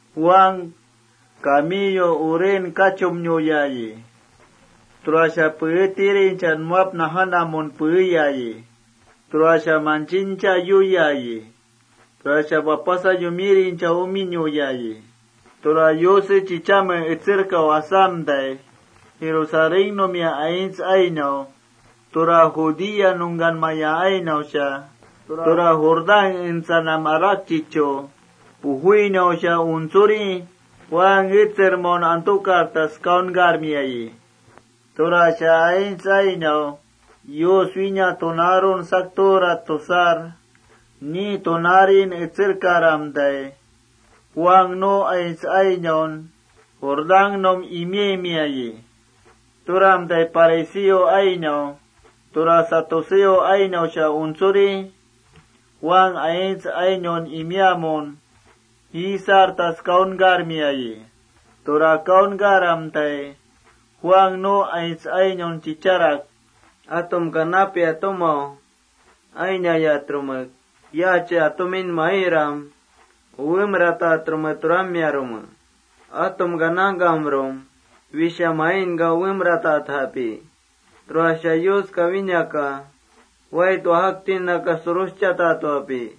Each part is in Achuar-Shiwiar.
Juan kamiyu uren kachumnuyayi. Tura peetirincha nuwap najanamun peeyayi. Tura manchincha yuyayi. Tura wapasa yumirincha uminuyayi. Tura Yuse chichamen etsermatai, Jerusalénnumia aints ainau, tura Judea nungkanmaya ainausha, tura Jordán entsanam arakchichu pujuinausha untsuri Juan etsermaun antukartas kaunkarmiayi. Tura aints ainau: Yus wína tunaarun sakturat tusar ni tunaarin etserkaramtai, Juan nu aints ainaun Jordánnum imaimiayi. Turamtai fariseo ainau, tura saduceo ainausha untsuri Juan aints ainaun imiaamun jiisartas kaunkarmiayi. Tura kaunkaramtai, Juan nu aints ainaun chicharak: —Atumka napia tumau ainarmincha ¿yaachia atumin mairam uwemratatrume turamiarume? Atumka nangkamrum: Wisha mainka uwemrainjapi, tura Yuska winaka wait wajaktinnaka suruschaintapi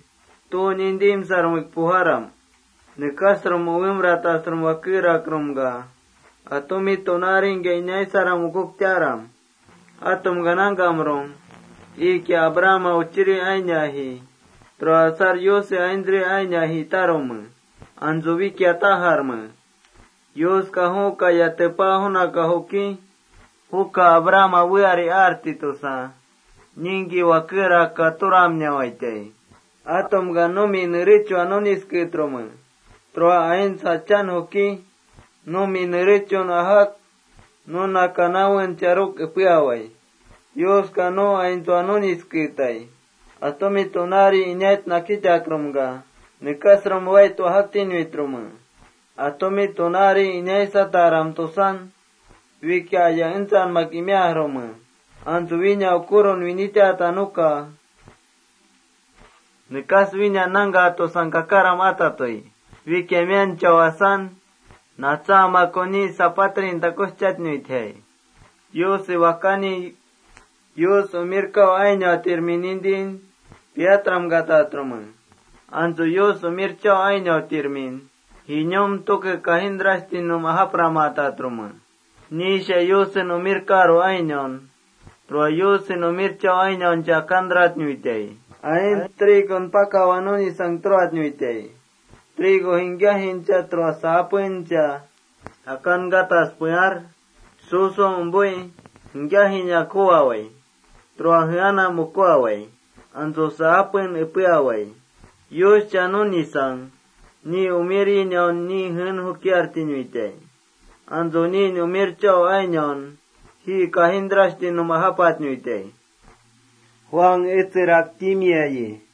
¿tu nintimsarmesha pujarme?+ Nekasrum uwemratasrum wakerakrumka, atumi tunaaringkia inaisaram ukuktaram. Atumka nangkamrum: Iikia Abrahama uchirinji, tura asar Yuse aintsri ainiaji tarume. Antsu wikia tajarme: Yuska ju kaya tepa junaka juki: Juka Abrahama weari ati tusa, ningki wakerakka turamnawaitai. Atumka numi nerechua nunisketrume. Tura aints jachan juki numi nerechun ajak nuna kanawen charur epeawai. Yuska nu aintsua nunisketai. Atumi tunaari inait nakitakrumka, nekasrum wait wajaktinuitrume.+ Atumi tunaari inaisaram Yus umirkataram tusan, wikia aya entsanmak imiajrume. Antsu wína ukurun winitata nuka wína nangkatusang kakaram atatui. Wikia mianchau asan, natsaamakun ni sapatrin takuschatnuitjai. Yuse Wakani Yusnau ainautirmi nintin piatramkatatrume. Antsu Yus umirchau ainautirminka ji kajintrashtinnum japramatatrume.+ Niisha Yusnau ainaun, tura Yusen umirchau ainauncha akantratnuitai. Aints trigon pakawa nunisang turatnuitai. Trigo jingkiajincha, tura saapencha akankatas pear su su umpui jingkiajinak juwawai tura jeanam ukuawai. Antsu saapen epeawai. Yuscha nunisang niinu ainaunka ni jeen jukiartinuitai. Antsu niin umirchau ainaunka ji kajintrashtinnum japatnuitai, —Juan etserak timiayi.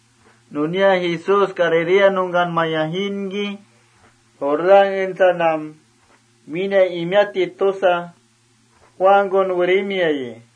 Nunia Jesús Galilea nungkanmaya jiinki, Jordán entsanam wína imiatti tusa Juankun werimiayi.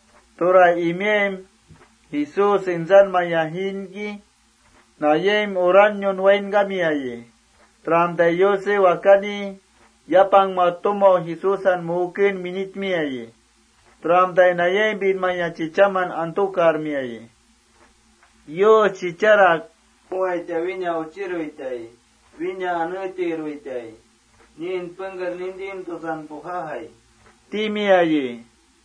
Tura imiaim, Jesús entsanmaya jiinki, nayaim uranniun wainkamiayi. Turamtai Yuse Wakani yapangma tumau Jesúsa muuken winitmiayi. Turamtai nayaimpinmaya chichaman antukarmiayi. Nu chichamka nuwaitai. —Juka wína Uchiruitai, wína aneetiruitai. Niin pengker nintimtusan pujajai, —Yus timiayi.